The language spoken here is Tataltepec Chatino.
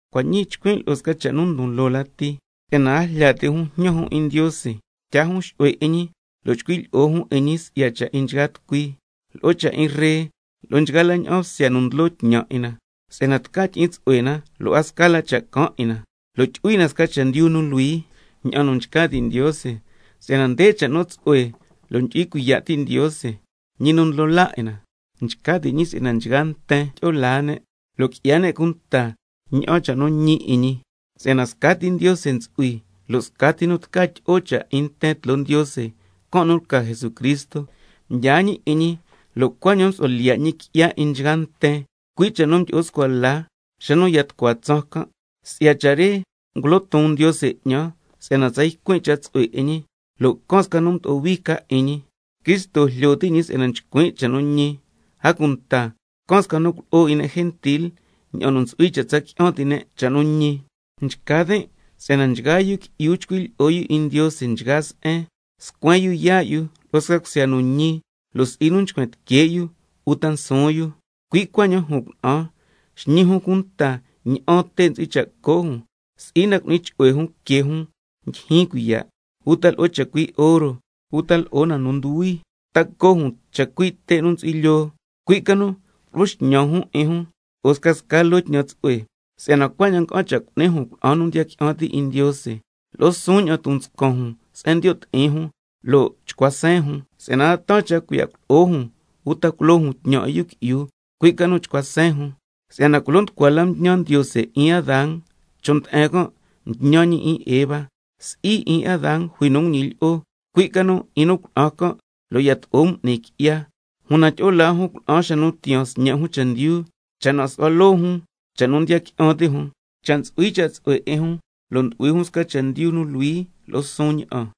Cua' ñii chcuin' lo'o sca cha' nu ndon loo lati, si'yana a jlya ti' jun jñan jun 'in Ndiose, tyaa jun xu'hue 'in ñi, lo' chcui' lyi'o jun 'in ñi si'ya cha' 'in nchgaa tucui, lo'o cha' 'in ree, lo'o nchgaa la ña'an bsya nu ndlo tñan 'in na, si'yana tca tyi'in tsu'hue na, a sca la cha' caan 'in na, lo' tyu'hui na sca chendyu nu luhui ña'an nu nchca ti' Ndiose. Si'yana nde cha' nu tsu'hue lo' ndyu'hui cuiya' ti' Ndiose, ñi nu Ndlo laa 'in na: Nchca ti' ñi si'yana nchgaa nten tyi'o laa ne', lo' qui'ya ne' cunta ña'an cha' nu ñi 'in ñi. Si'yana scati Ndiose ntsu'hui, lo' scati nu tca tyi'o cha' 'in nten tloo Ndiose, can' nu lca Jesucristo. Mdyaa ñi 'in ñi lo' cuaña'an msu'hua lyiya' ñi qui'ya 'in nchgaa nten, cui' cha' nu mdyi'o scua la xa nu ya tucua tsaan can'. Cui' si'ya cha' re ngulo ton Ndiose 'ñan, si'yana tsa ycuin' cha' tsu'hue 'in ñi, lo' can sca nu mdo'o hui ca 'in ñi, (Cristo jlyo ti' ñi si'yana nchcuin' cha' nu ñi), a cunta can sca nu culo'o 'in ne' gentil ña'an nu ntsu'hui cha' tsa qui'an ti' ne' cha' nu ñi. Nchca tin' si'yana nchgaa yu qui'yu chcui' lyi'o yu 'in Ndiose nchgaa se'en, scuen yu yaa' yu lo'o sca cusya nu ñi, lo' si'i na nchcuen tique' yu uta nsuun yu. Cui' cuaña'an jun cuna'an xñi jun cunta ña'an te' ntsu'hui cha' co' jun, si'i na cu'ni chu'hue jun que jun ndyijyin cuiya', uta lo'o chacui' oro, uta lo'o na nu nduhui, ta co' jun chacui' te' nu ntsu'hui lyoo. Cui' ca nu culo'o xñan jun 'in jun lo'o scasca loo tñan tsu'hue, si'yana cuaña'an nga'an cha' cu'ni jun cuna'an nu ndiya qui'an ti' 'in Ndiose. Lo'o suun ña'an ton nscan jun se'en ndiyo' ti'in jun lo' chcua seen jun. Si'yana a taan cha' cuiya' culo'o jun uta culo jun tñan 'in yu qui'yu, cui' ca nu chcua seen jun. Si'yana culo nducua mtñan Ndiose 'in Adán, chon' nde'en can' mtñan ñi 'in Eva. Si'i 'in Adán jui nu nguñilyi'o, cui' ca nu 'in nu cuna'an can', lo' yato'o m'ni ne' qui'ya. Una tyi'o laa jun cuna'an xa nu tiyaan sñe' jun chendyu, cha' na nsu'hua loo jun cha' nu ndiya qui'an ti' jun, cha' ntsu'hui cha' tsu'hue 'in jun lo' ndu'hui jun sca chendyu nu luhui lo'o suun ña'an.